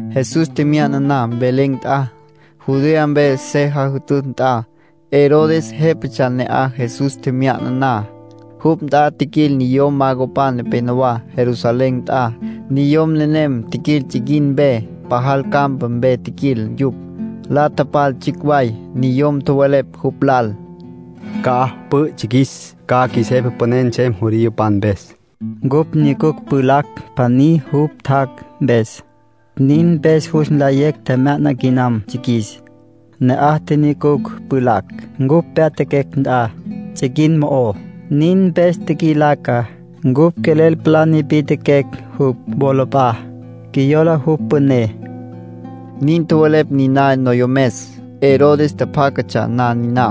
Jesús tjemya'na Belén nt'a, Judea mpe se jütütj nt'a. Herodes jépatsja ne'aj Jesús tjemya'na na. Jupj nt'a tjiquil niyom magopan nepenowá, Jerusalén nt'a. Niyom nenem tjiquil tsiquin mpe, pajal campa mpe tjiquil yupj, la tapal tsjicj way. Niyom tjowelepj jupj lal: —¿Ca'aj pü'ü tsjiquis, ca jepa püné nsem judiopan mpes? Ncupj nyucucj pjulacj pjaní jupj tjac' mpes. Nin mpes jus nlayecj tjemya'na quinam tsjiquis. Ne'aj tjinyucucj pjulacj, cupj pyatjaquecj nt'a, tsiquin mo'ó. Nin mpes tjiquilaca. Cupj quelel palá nipi'tjiquecj jupj wolap'a'á, qjuiyola jupj püné —nin tjowelepj niná noyomes. Herodes tjapjácatsja na niná,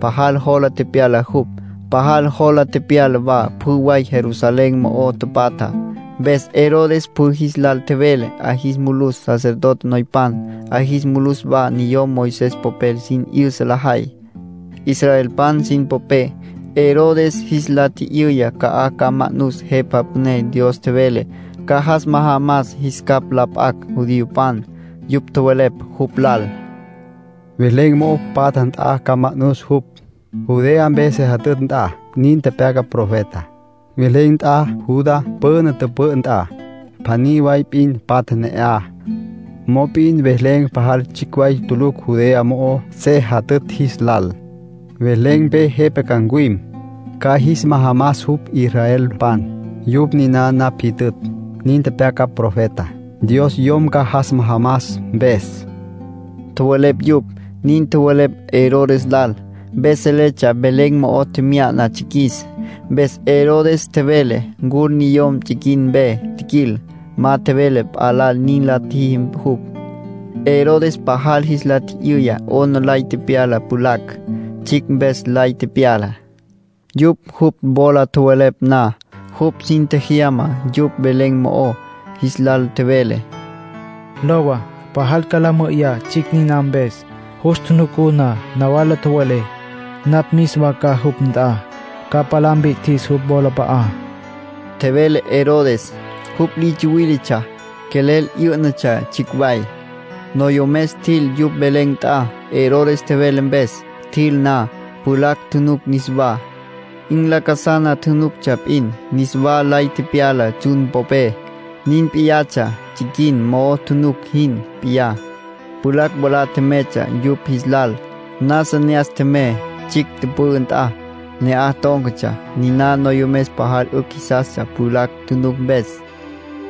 pajal jola tepyala jupj. Pajal yola tepyala wa pjü way Jerusalén mo'o tapatjá. Mpes Herodes pjü jis lal tjevele 'a jis mulus sacerdote noypan, 'a jis mulus wa niyom Moisés popel sin 'yüsa lajay, israelpan sin popé. Herodes jis la tji'yüya ca'aj ca ma'nus Jepa Püné Dios tjevele ca jas majamas jis capj la p'acj judiopan. Yupj tjowelepj jupj lal: —Belén mo'o patja nt'a ca ma'nus jupj, Judea mpe se jütütj nt'a. Nin tepyaca profeta: ‘Belén nt'a, Judá püna tüpü'ü nt'a, pjaní way p'in patja ne'aj. Mop'in Belén pajal tsjicj way tulucj Judea mo'o se jütütj jis lal. Belén mpe jepa ca ncuwim. Ca jis majamas jupj israelpan, yupj niná napj jyütütj.’ Nin tepyaca profeta, Dios Yom ca jas majamas mpes —tjowelepj yupj. Nin tjowelepj Herodes lal, mpes seletsja Belén mo'o tjemya'na tsjiquis. Mpes Herodes tjevele ncul niyom tsiquin mpe tjiquil. Ma tjevele p'a lal nin la tjiji jupj. Herodes pajal jis la tji'yüya 'ona lay tepyala pjulacj, tsjicj mpes lay tepyala. Yupj jupj wola tjowelepj na, jupj sin tjejyama yupj Belén mo'ó. Jis lal tjevele: —Lowa, pajal ca la mü'üyá tsjicj niná mpes. Jus tjunucú na, nawala tjowelé. Napj mis wa ca jupj nt'a, ca palá mpi'tjis jupj wolap'a'á —tjevele Herodes. Jupj li tsuwíletsja. Quelel 'yǘ'natsja tsjicj way. Noyomes tjil yupj Belén nt'a, Herodes tjevele mpes. Tjil na, pjulacj tjunuc niswá, 'in lacasana tjunuctsja p'in. Niswa lay tepyala tsjun popé. Nin p'iyatsja tsiquin mo'o tjunuc jin p'iyá. Pjulacj mwalá tjemeytsja yupj jis lal, nasa ne'as tjemey tsjicj tüpü'ü nt'a. Ne'aj tón̈catsja. Niná noyomes pajal 'ücj jisastsja pjulacj tjunuc mpes.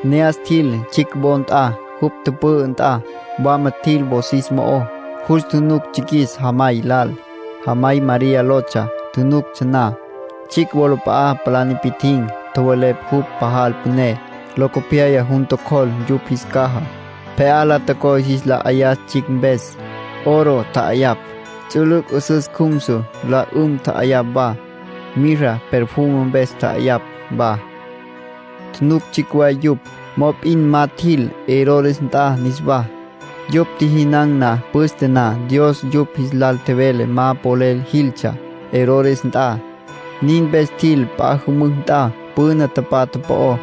Ne'as tjil tsjicj wo nt'a, jupj tüpü'ü nt'a. Wama tjil, wosis mo'ó. Jus tjunuc tsjiquis jamay lal. Jamay María lotsja. Tjunuctsja na, tsjicj wolap'a'a palá nipi'tjin̈. Tjowelepj jupj pajal püné. Locopyaya jun tjocjol yupj jis caja, pje'á la tocoy jis la 'ayas tsjicj mpes. Oro tja'ayapj. Ts'ülüc' 'üsüs cjumsu la 'üm tja'ayapj wa. Mirra perfume mpes tja'ayapj wa. Tjunuc tsjicj way yupj, mop'in ma tjil Herodes nt'a niswá. Yupj tjijinan̈ na püste na, Dios yupj jis lal tjevele ma polel jiltsja Herodes nt'a. Nin mpes tjil p'a jümücj nt'a, püna tapatja po'ó.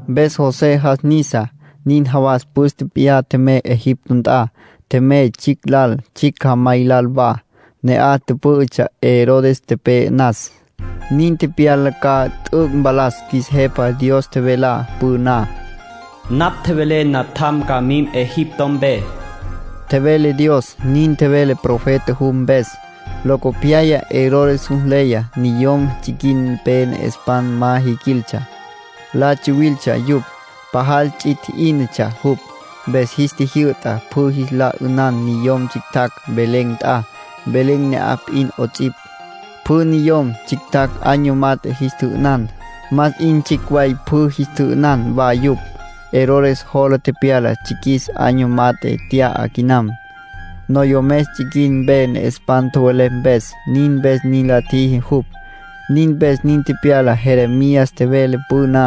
Mpes José jas nisa, nin jawas püste p'iyá tjemey Egipto nt'a. Tjemey tsjicj lal, tsjicj jamay lal wa. Ne'aj tüpǘ'ütsja Herodes tepe'e nas. Nin tepyala ca t'üc' mpalas qjuis Jepa Dios tjevelá püná. “Napj tjevelé natjam ca mim Egipto mpe”, tjevele Dios. Nin tjevele profeta jupj mpes. Locopyaya Herodes jus nleya niyom tsiquin mpe ne'espan ma jiquiltsja. La tsawiltsja yupj. Pajal ts'i tji'ínatsja jupj. Mpes jis tjijyü'ta pjü jis la 'ünan niyom tsjictjacj Belén nt'a, Belén ne'aj p'in 'ots'ipj. Pjü niyom tsjictjacj año mat'e jis tjü'ünan. Más 'in tsjicj way pjü jis tjü'ünan wa yupj. Herodes jola tepyala tsjiquis año mat'e tya'a quinam, noyomes tsiquin mpe ne'espan tjowelepj mpes. Nin mpes nin la tjiji jupj. Nin mpes nin tepyala Jeremías tjevele püná.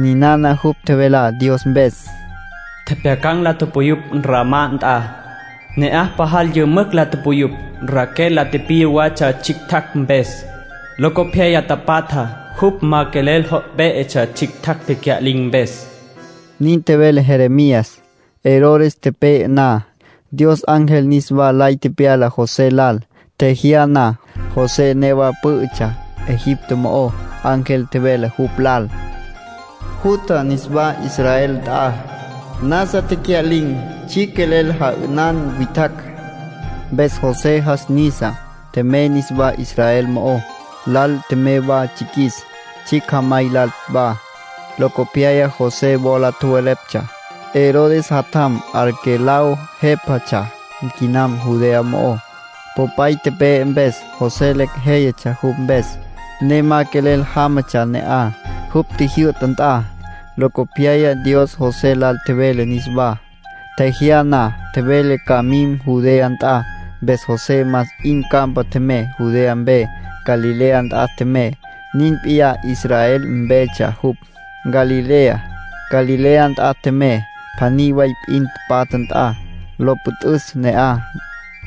Ninana jupj tjevelá Dios mpes: “Tjepjyacan̈ la puyupj Ramá nt'a. Ne'aj pajal yümücj la tupuyupj. Raquel la tipiya watsja tsjictjacj mpes, locopyaya tapatjá. Jupj ma quelel jo' pé'etsja, tsjictjacj tecya'lin̈ mpes.” Nin tjevele Jeremías. Herodes tepe'e na, Dios ángel niswa lay tepyala José lal, tjejyá na. José newa pǘ'ütsja Egipto mo'ó. Ángel tjevele jupj lal: “Jutja niswá Israel nt'a. Nasa tecya'lin̈ tsjicj quelel ja'ünan witjacj.” Mpes José jas nisa, tjemey niswá Israel mo'ó. Lal tjemey wa tsjiquis, tsjicj jamay lal wa. Locopyaya José wola tjoweleptsja Herodes jatjam Arquelao jepa tjá'asa quinam Judea mo'ó, popay tepe'e mpes. José lecj jéyatsja jupj mpes, ne ma quelel jámatsja ne'aj, jupj tjijyü'ta nt'a. Locopyaya Dios José lal tjevele niswá, tjejyá na. Tjevele ca ma mim Judea nt'a. Mpes José más 'in campa tjemey Judea mpe. Galilea nt'a tjemey, nin p'iyá Israel mpetsja jupj, Galilea. Galilea nt'a tjemey, pjaní way p'in patja nt'a, lo püt'üs ne'aj.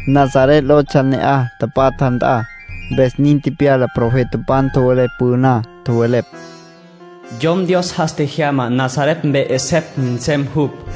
Nazaret lotsja ne'aj tapatja nt'a. Mpes nin tepyala profetapan tjowelepj püná. Tjowelepj: “Yom Dios jas tjejyamá Nazaret mpe 'esepj nsem jupj”.